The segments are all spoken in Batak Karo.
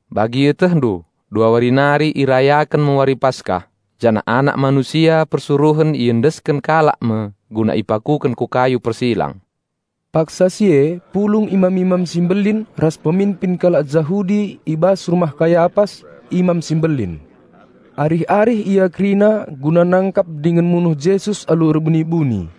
"Bagi ietehndu, dua wari nari irayaken me Wari Paskah, janah Anak Manusia persuruhen iendesken kalak me guna ipakuken ku kayu persilang." Paksa si e pulung imam-imam si mbelin ras peminpin kalak Jahudi i bas rumah Kayapas, Imam si Mbelin. Arih-arih ia kerina guna nangkap dingen munuh Jesus alu erbuni-buni.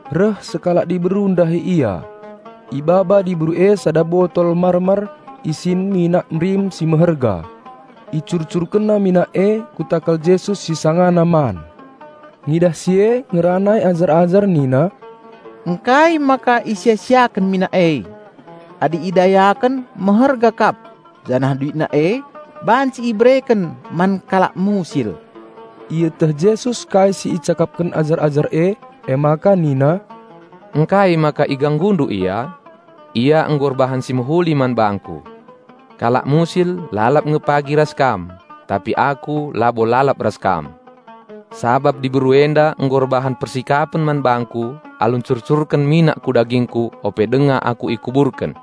reh sekalak diberu ndahi Ia. Ibaba diberu e sada botol mar-mar isin minak merim si meherga. Icurcurkenna minak e ku takal Jesus si sangana man. Ngidah si e ngeranai ajar-ajar nina, "Ngkai maka isia-siaken minak e? Adi idayaken meherga kap janah duitna e banci ibereken man kalak musil!" Ieteh Jesus kai si icakapken ajar-ajar e emaka nina, "Ngkai maka iganggundu ia? Ia nggo erbahan si mehuli man bangKu. Kalak musil lalap nge pagi ras kam, tapi Aku labo lalap ras kam. Sabap diberu enda nggo erbahan persikapen man bangKu alu ncurcurken minak ku dagingKu ope denga Aku ikuburken.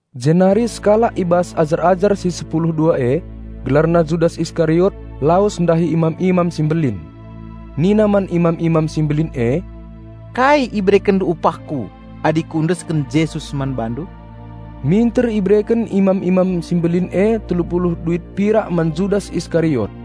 Jenari sekalak i bas ajar-ajar si sepulu dua e, gelarna Judas Iskariot lawes ndahi imam-imam si mbelin. Nina man imam-imam si mbelin e, "Kai iberekenndu upahku adi kuendesken Jesus man bandu?" Minter ibereken imam-imam si mbelin e telu puluh duit pirak man Judas Iskariot.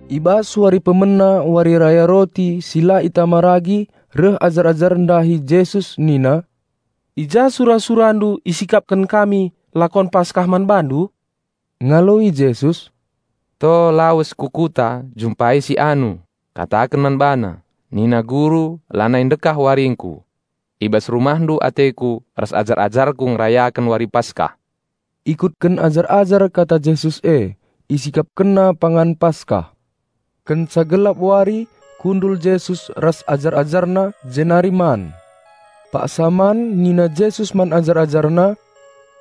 I bas wari pemena Wari Raya Roti si la erragi reh ajar-ajar ndahi Jesus nina, "I ja sura-SuraNdu isikapken kami roti Paskah man BaNdu?" Ngaloi Jesus, "To lawes ku kuta njumpai si Anu, kataken man bana: nina Guru lanai ndekah waringKu. I bas rumahndu ateKu ras ajar-ajarKu ngerayaken Wari Paskah." Ikutken ajar-ajar kata Jesus e; isikapkenna pangan Paskah. Kenca gelap wari kundul Jesus ras ajar-AjarNa jenari man. Paksa man nina Jesus man ajar-AjarNa,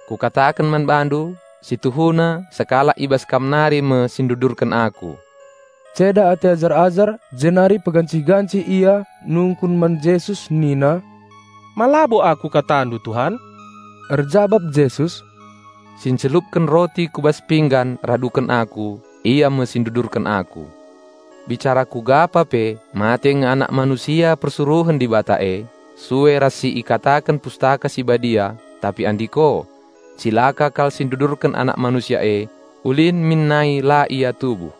"Kukataken man bandu: Si tuhuna sekalak i bas kam nari me si ndudurken Aku." Ceda ate ajar-ajar jenari pegancih-gancih ia nungkun man Jesus nina, "Ma labo aku KataNdu Tuhan?" Erjabap Jesus, "Si ncelupken roti ku bas pinggan raduken Aku, ia me si ndudurken Aku. Bicara kugapa pe mate nge Anak Manusia persuruhen Dibata e, sue ras si ikataken Pustaka Si Badia tapi andiko, cilaka kal si ndudurken Anak Manusia e. Ulin min nai la ia tubuh."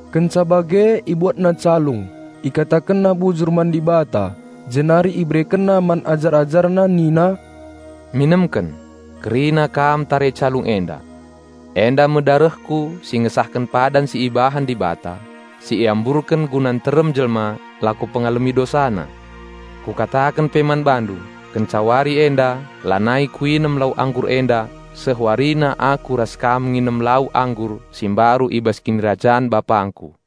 Kenca bage IbuatNa calung, IkatakenNa bujur man Dibata, jenari IberekenNa man ajar-AjarNa nina, "Minemken, kerina kam tare calung enda. Enda me darehKu si ngesahken iketen padan si ibahan Dibata, si iamburken guna nterem jelma lako ngalemi dosana. Kukataken pe man bandu: Kenca wari enda lanai Kuinem lau anggur enda seh warina Aku ras kam nginem lau anggur si mbaru i bas Kinirajan BapangKu."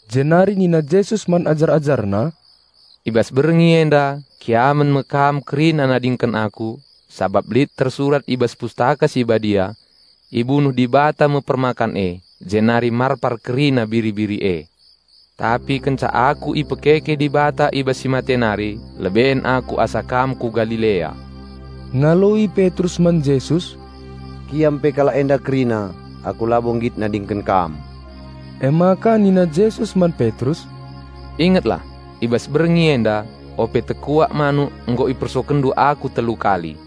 Jenari nina Jesus man ajar-AjarNa, "I bas berngi enda kiamen me kam kerina nadingken Aku, sabap lit tersurat i bas Pustaka Si Badia, 'Ibunuh Dibata me permakan e, jenari marpar kerina biri-biri e.' Tapi kenca Aku ipekeke Dibata i bas si mate nari leben Aku asa kam ku Galilea." Ngaloi Petrus man Jesus, "Kiam pe kalak enda kerina, aku labo nggit nadingken Kam!" Emaka nina Jesus man Petrus, "Ingetlah! I bas berngi enda, ope tekuak manuk nggo ipersokenndu Aku telu kali."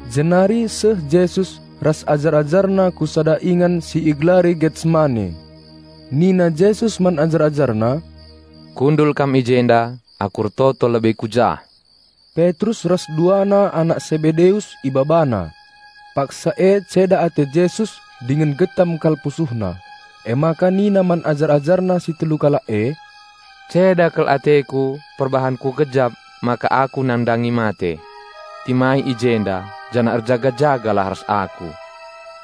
Jenari seh Jesus ras ajar-AjarNa ku sada ingan si igelari Getsemane. Nina Jesus man ajar-AjarNa, "Kundul kam i jenda, Aku ertoto lebe ku jah." Petrus ras duana anak Sebedeus IbabaNa. Paksa e ceda ate Jesus dingen getem kal PusuhNa. Emaka nina man ajar-AjarNa si telu kalak e, "Ceda kal ateKu perbahan Kugejap maka Aku nandangi mate. Timai i jenda janah erjaga-jagalah ras Aku."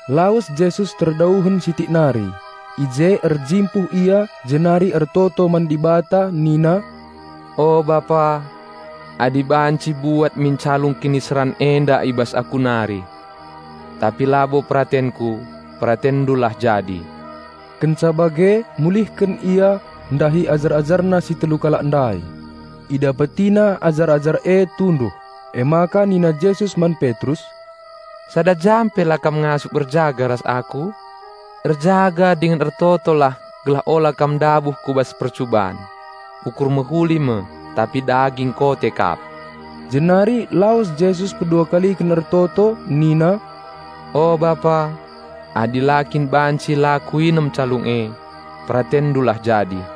Lawes Jesus terdauhen sitik nari, i je erjimpuh Ia jenari ertoto man Dibata nina, "O Bapa, adi banci buat min calung kiniseran enda i bas Aku nari. Tapi labo peratenKu, PeratenNdulah jadi." Kenca bage mulihken Ia ndahi ajar-AjarNa si telu kalak ndai. IdapetiNa ajar-ajar e tunduh. Emaka nina Jesus man Petrus, "Sada jam pe la kam ngasup erjaga ras Aku? Erjaga dingen ertotolah gelah ola kam ndabuh ku bas percuban. Ukur manusia mehuli kap tapi kote kap dagingna!" Jenari lawes Jesus pedua kaliken ertoto nina, "O Bapa, adi la kin banci la Kuinem calung e, PeratenNdulah jadi."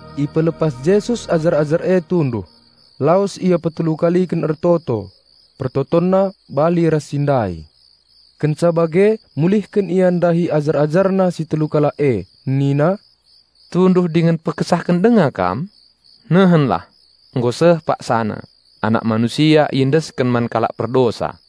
Ipelepas Jesus ajar-ajar e tunduh, lawes Ia petelu kaliken ertoto; PertotonNa bali ras si ndai. Kenca bage mulihken Ia ndahi ajar-AjarNa si telu kalak e, nina, "Tunduh dingen pekesahken denga kam? Nehenlah! Nggo seh paksana, Anak Manusia persuruhen iendesken man kalak perdosa.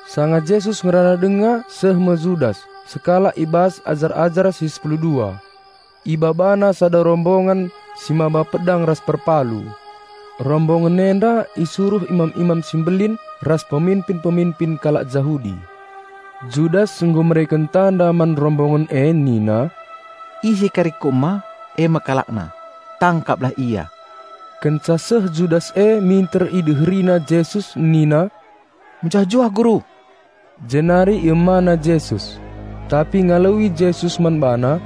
Sanga Jesus ngerana denga seh me Judas, sekalak i bas ajar-ajar si sepulu dua. Ibabana sada rombongan si maba pedang ras perpalu. Rombongan enda isuruh imam-imam si mbelin ras peminpin-peminpin kalak Jahudi. Judas nggo mereken tanda man rombongen e nina, "Ise kari kuema e me kalakna. Tangkaplah Ia!" Kenca seh Judas e minter ideherina Jesus nina, "Mejuah-juah Guru," jenari iemana Jesus. Tapi ngaloi Jesus man bana,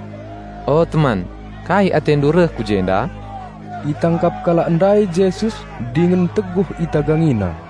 "O teman, kai atendu reh ku jenda?" Itangkap kalak ndai Jesus, dingen nteguh itagangina.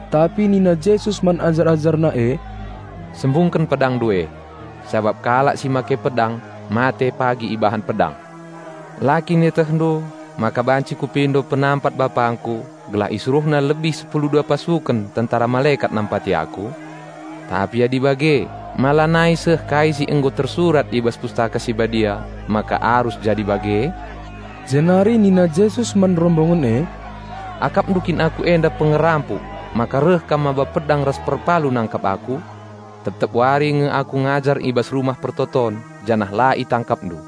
Tapi nina Jesus man ajar-AjarNa e, "Sembungken pedangndu e, sabap kalak si make pedang mate pagi ibahan pedang. La kin ietehndu maka banci Kupindo penampat BapangKu gelah IsuruhNa lebih sepulu dua pasuken tentera malekat nampati Aku? Tapi adi bage, ma lanai seh kai si nggo tersurat i bas Pustaka Si Badia, maka arus jadi bage?" Jenari nina Jesus man rombongen e, "Akapndu kin Aku enda pengerampok maka reh kam maba pedang ras perpalu nangkap Aku? Tep-tep wari nge Aku ngajar i bas Rumah Pertoton janah la itangkapndu.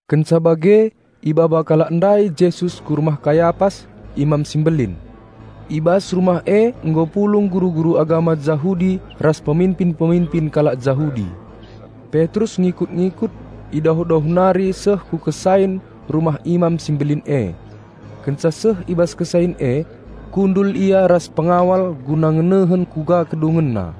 Kenca bage ibaba kalak ndai Jesus ku rumah Kayapas, Imam si Mbelin. I bas rumah e nggo pulung guru-guru agama Jahudi ras peminpin-peminpin kalak Jahudi. Petrus ngikut-ngikut i dauh-dauh nari seh ku kesain rumah Imam si Mbelin e. Kenca seh i bas kesain e, kundul ia ras pengawal guna ngenehen kuga kedungenna.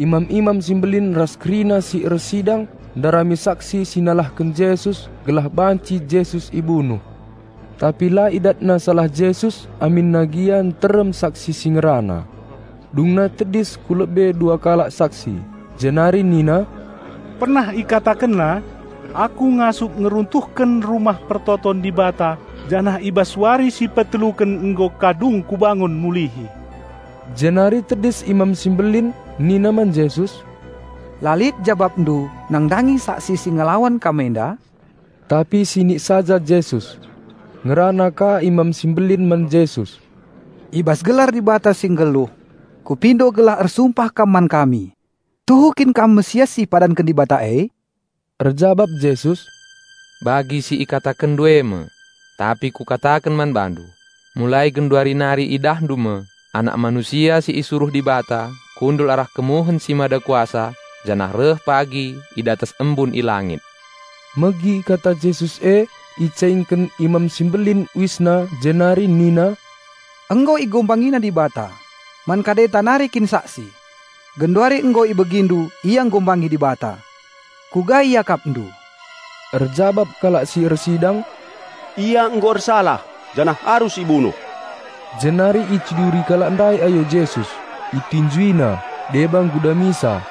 Imam-imam si mbelin ras kerina si ersidang ndarami saksi si nalahken Jesus gelah banci Jesus ibunuh. Tapi la idatna salah Jesus aminna gia nterem saksi si ngerana. Dungna tedis ku lebe dua kalak saksi, Jenari nina, "Pernah IkatakenNa, 'Aku ngasup ngeruntuhken Rumah Pertoton Dibata janah i bas wari si peteluken nggo ka dung Kubangun mulihi.'" Jenari tedis Imam si Mbelin nina man Jesus, "La lit jabapndu nandangi saksi si ngelawan Kam enda?" Tapi sinik saja Jesus. Ngerana ka Imam si Mbelin man Jesus, "I bas gelar Dibata si nggeluh kupindo gelah ersumpah kam man kami: Tuhu kin Kam Raja Penampat si ipadanken e Anak Dibata?" Erjabap Jesus, "Bagi si ikatakenndu e me. Tapi Kukataken man bandu: Mulai genduari nari idahndu me, Anak Manusia si isuruh Dibata kundul arah kemuhen si Mada Kuasa janah reh pagi i datas embun i langit." Megi kata Jesus e, emaka icaingken Imam si Mbelin uisna jenari nina, "Nggo IhinaNa Dibata! Man kadenta nari kin saksi? Genduari nggo ibegindu Ia enghina Dibata. Kuga iakapndu?" Erjabap kalak si ersidang, "Ia nggo ersalah janah arus ibunuh." Jenari iciduri kalak ndai ayo Jesus, itinjuina, deba nggudamisa,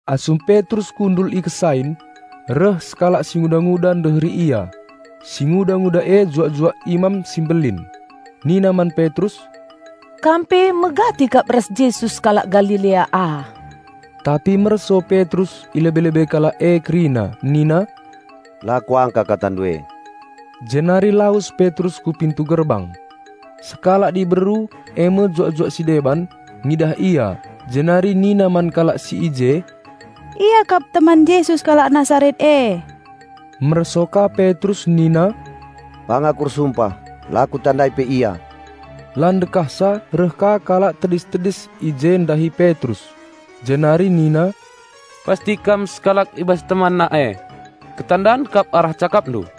Asum Petrus kundul i kesain, reh sekalak singuda-nguda ndeheri ia; singuda-nguda e juak-juak Imam si Mbelin. Nina man Petrus, "Kam pe megati kap ras Jesus kalak Galilea ah." Tapi merso Petrus i lebe-lebe kalak e kerina nina, "La kuangka katandu e." Jenari lawes Petrus ku pintu gerbang. Sekalak diberu, eme juak-juak si deban, ngidah ia, jenari nina man kalak si i je, "Ia kap teman Jesus kalak Nasaret e." Merso ka Petrus nina, "Pang aku ersumpah, la kutandai pe Ia!" La ndekahsa reh ka kalak tedis-tedis i je ndahi Petrus, jenari nina, "Pasti kam sekalak i bas TemanNa e. Ketandan kap arah cakapndu!"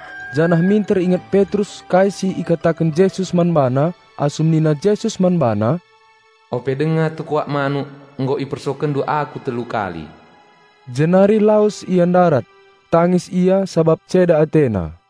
Janah minter inget Petrus kai si ikataken Jesus man bana, asum nina Jesus man bana, "Ope denga tekuak manuk nggo ipersokenndu Aku telu kali." Jenari lawes ia ndarat, tangis ia sabap ceda atena.